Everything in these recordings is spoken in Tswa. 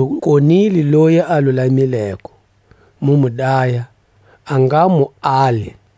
Mu konile loyi a lulamileko, mu mu daya; a nga mu ali. Kutimisela ni kukombela.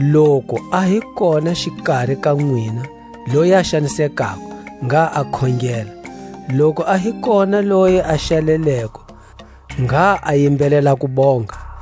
Loku a hi kona xikari ka nwina loyi a xanisekako, ngha a khongela; loku a hi kona leyi a xaleleko, ngha a yimbelela kubonga.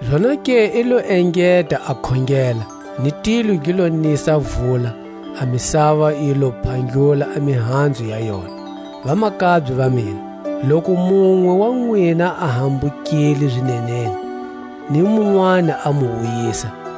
Zonake i lo engeta a khongela, ni tilo gi lo nisa vula, a misava yi lo phandlula a mihanzu ya yona. Vamakabye va mina, loku munwe wa nwina a hambukile zineneni, ni munwani a mu wuyisa,